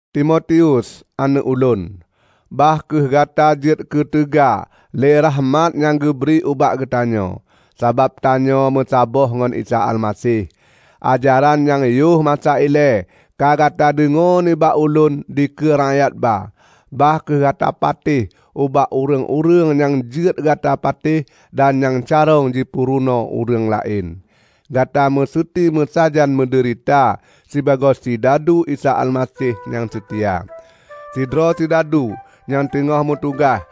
Timotius, aneuëk ulôn! Bah kheueh gata jeuet keuteuga lé rakhmat nyang geubri ubak geutanyoe, sabab tanyoe meusaboh ngon Isa Almaseh. Ajaran nyang yoh masa ilée ka gata deungoe nibak ulôn dikeue rakyat ba, bah kheueh gata patéh ubak ureuëng-ureuëng nyang jeuet gata patéh dan nyang carông jipeurunoe ureuëng laén. Gata meuseuti meusajan meudeurita sibagoe sidadu Isa Almaseh nyang seutia. Sidroe sidadu nyang teungoh meutugaih,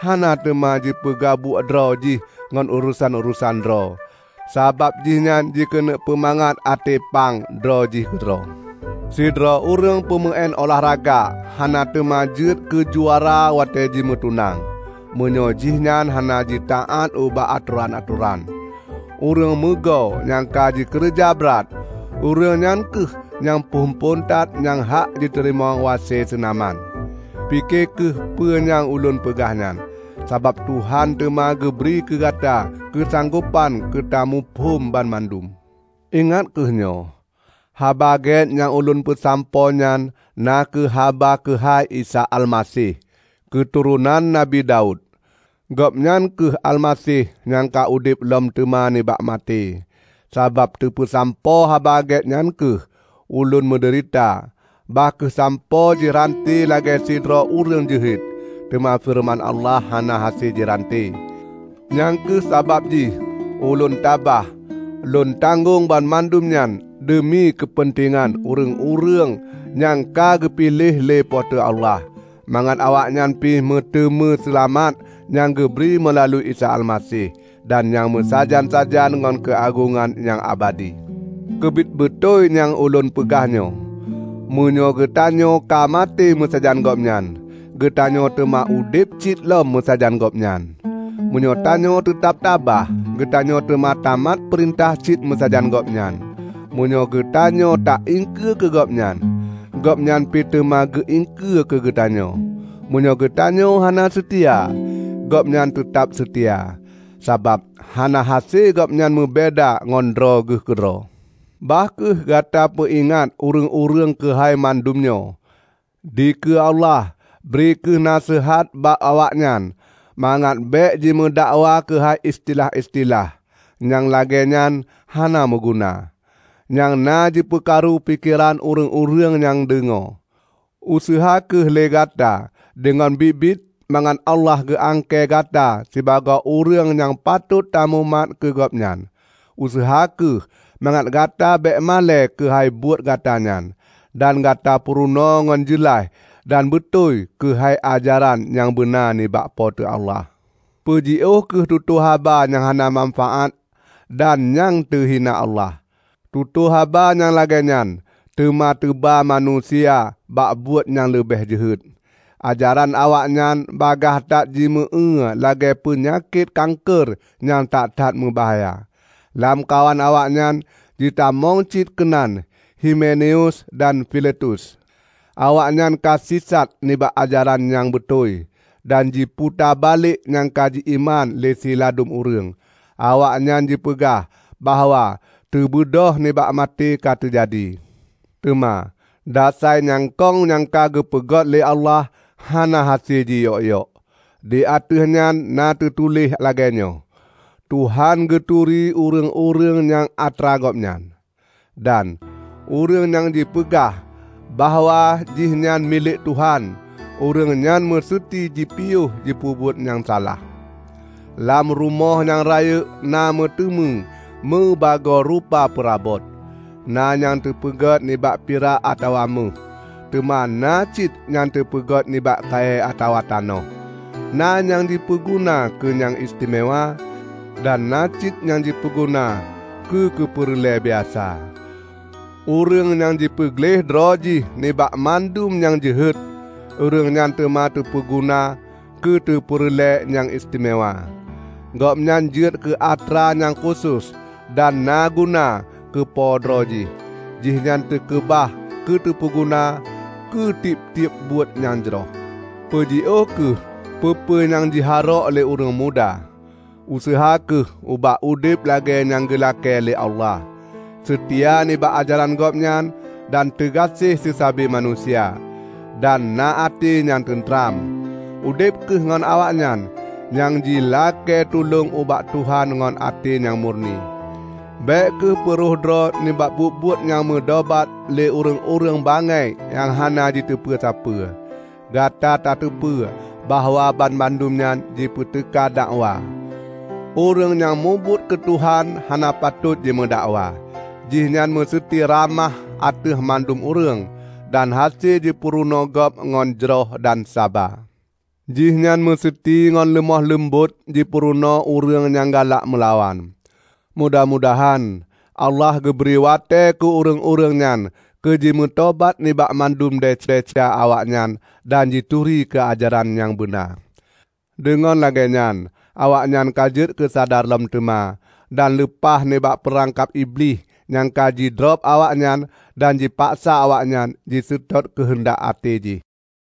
hana teuma jipeugabuek droe jih ngon urosan-urosan droe, sabab jihnyan jikeuneuk peumangat até pang droe jih keudroe. Sidroe ureuëng peumeuén ulah raga hana teuma jeuet keujuara watée jimeutunang, meunyoe jihnyan hana jitaát ubak atoran-atoran. Ureuëng meugo nyang ka jikeureuja brat, ureuëng nyan kheueh nyang phon-phon that nyang hak jiteurimong wase seunaman. Pike kheueh peue nyang ulôn peugah nyan, sabab Tuhan teuma geubri keugata keusanggopan keutamuphom banmandum. Ingat kheueh nyoe: Haba Gét nyang ulôn peusampoe nyan na kheueh haba keuhai Isa Almaseh, keuturonan Nabi Daud; Gobnyan kheueh Almaseh nyang ka udeb lom teuma nibak maté. Sabab teupeusampoe Haba Gét nyan kheueh, ulôn meudeurita; bahkheueh sampoe jiranté lagée sidroe ureuëng jeuhet. Teuma feureuman Allah hana hase jiranté. Nyang kheueh sabab jih ulôn tabah lôn tanggong banmandum nyan deumi keupeuntengan ureuëng-ureuëng nyang ka geupiléh lé Po teu Allah, mangat awaknyan pi meuteumé seulamat nyang geubri meulalu Isa Almaseh, dan nyang meusajan-sajan ngon keuagongan nyang abadi. Keubiet beutôi nyang ulôn peugah nyoe, "Meunyoe geutanyoe ka maté meusajan Gobnyan, geutanyoe teuma udeb cit lom meusajan Gobnyan. Meunyoe tanyoe teutab tabah, geutanyoe teuma tamat peurintah cit meusajan Gobnyan. Meunyoe geutanyoe taiengkeue keu Gobnyan, Gobnyan pi teuma geuiengkeue keugeutanyoe. Meunyoe geutanyoe hana seutia, Gobnyan teutab seutia, sabab hana hase Gobnyan meubeda ngon droe Geuh keudroe." Bah kheueh gata peuingat ureuëng-ureuëng keuhai mandum nyoe. Dikeue Allah, bri kheueh naseuhat bak awaknyan mangat bék jimeudakwa keuhai istilah-istilah. Nyang lagée nyan hana meuguna, nyang na jipeukaru pikeran ureuëng-ureuëng nyang deungoe. Useuha kheueh lé gata deungon biet-biet mangat Allah geuangkée gata sibagoe ureuëng nyang patot tamubuet keu Gobnyan. Useuha kheueh mangat gata bék malée keuhai buet gata nyan, dan gata purunoe ngon jeulaih dan beutôi keuhai ajaran nyang beuna nibak Po teu Allah. Peujiôh kheueh tutoe haba nyang hana manfaát dan nyang teuhina Allah. Tutoe haba nyang lagée nyan teuma teuba manusia bak buet nyang leubeh jeuhet. Ajaran awaknyan bagaih that jimeu éue lagée peunyakét kanker nyang that-that meubahya. Lamkawan awaknyan jitamong cit keunan Himeneus dan Filetus. Awaknyan ka sisat nibak ajaran nyang beutôi, dan jiputa balék nyang ka ji-iman lé siladum ureuëng. Awaknyan jipeugah bahwa teubeudôh nibak maté ka teujadi. Teuma dasai nyang kông nyang ka geupeugét Allah hana hase jiyok-yok. Di ateueh nyan na teutuléh lagée nyoe, "Tuhan geuturi ureuëng-ureuëng nyang atra Gobnyan", dan "Ureuëng nyang jipeugah bahwa jihnyan milék Tuhan, ureuëng nyan meuseuti jipiôh jipeubuet nyang salah". Lam rumoh nyang rayeuk na meuteumé meubagoe rupa peurabot. Na nyang teupeugét nibak pirak atawa méuh, teuma na cit nyang teupeugét nibak kayée atawa tanoh. Na nyang jipeuguna keu nyang istimewa, dan na cit nyang jipeuguna keu keupeureulée biasa. Ureuëng nyang jipeugleh droe jih nibak mandum nyang jeuhet, ureuëng nyan teuma teupeuguna keuteupeureulée nyang istimewa. Gobnyan jeuet keu atra nyang khusos dan naguna keu po droe jih. Jihnyan teukeubah keuteupeuguna keu tieb-tieb buet nyang jroh. Peujiôh kheueh peue-peue nyang jiharok lé ureuëng muda. Useuha kheueh ubak udeb lagée nyang geulakée lé Allah, seutia nibak ajaran Gobnyan dan teugaséh seusabe manusia, dan na até nyang teuntram. Udeb kheueh ngon awaknyan nyang jilakée tulông ubak Tuhan ngon até nyang murni. Bék kheueh peu rhoh droe nibak buet-buet nyang meudobat lé ureuëng-ureuëng bangai nyang hana jiteupeue sapeue. Gata tateupeue bahwa banmandum nyan jipeuteuka dakwa. Ureuëng nyang mubuet keu Tuhan hana patot jimeudakwa; jihnyan meuseuti ramah ateueh mandum ureuëng, dan hase jipeurunoe gob ngon jroh dan saba. Jihnyan meuseuti ngon leumoh leumbot jipeurunoe ureuëng nyang galak meulawan; mudah-mudahan Allah geubri watée keu ureuëng-ureuëng nyan keu jimeutobat nibak mandum desya-desya awaknyan dan jituri keu ajaran nyang beuna. Deungon lagée nyan awaknyan ka jeuet keusadar lom teuma, dan leupah nibak peurangkab Iblih nyang ka jidrob awaknyan dan jipaksa awaknyan jiseutôt keuheundak até jih.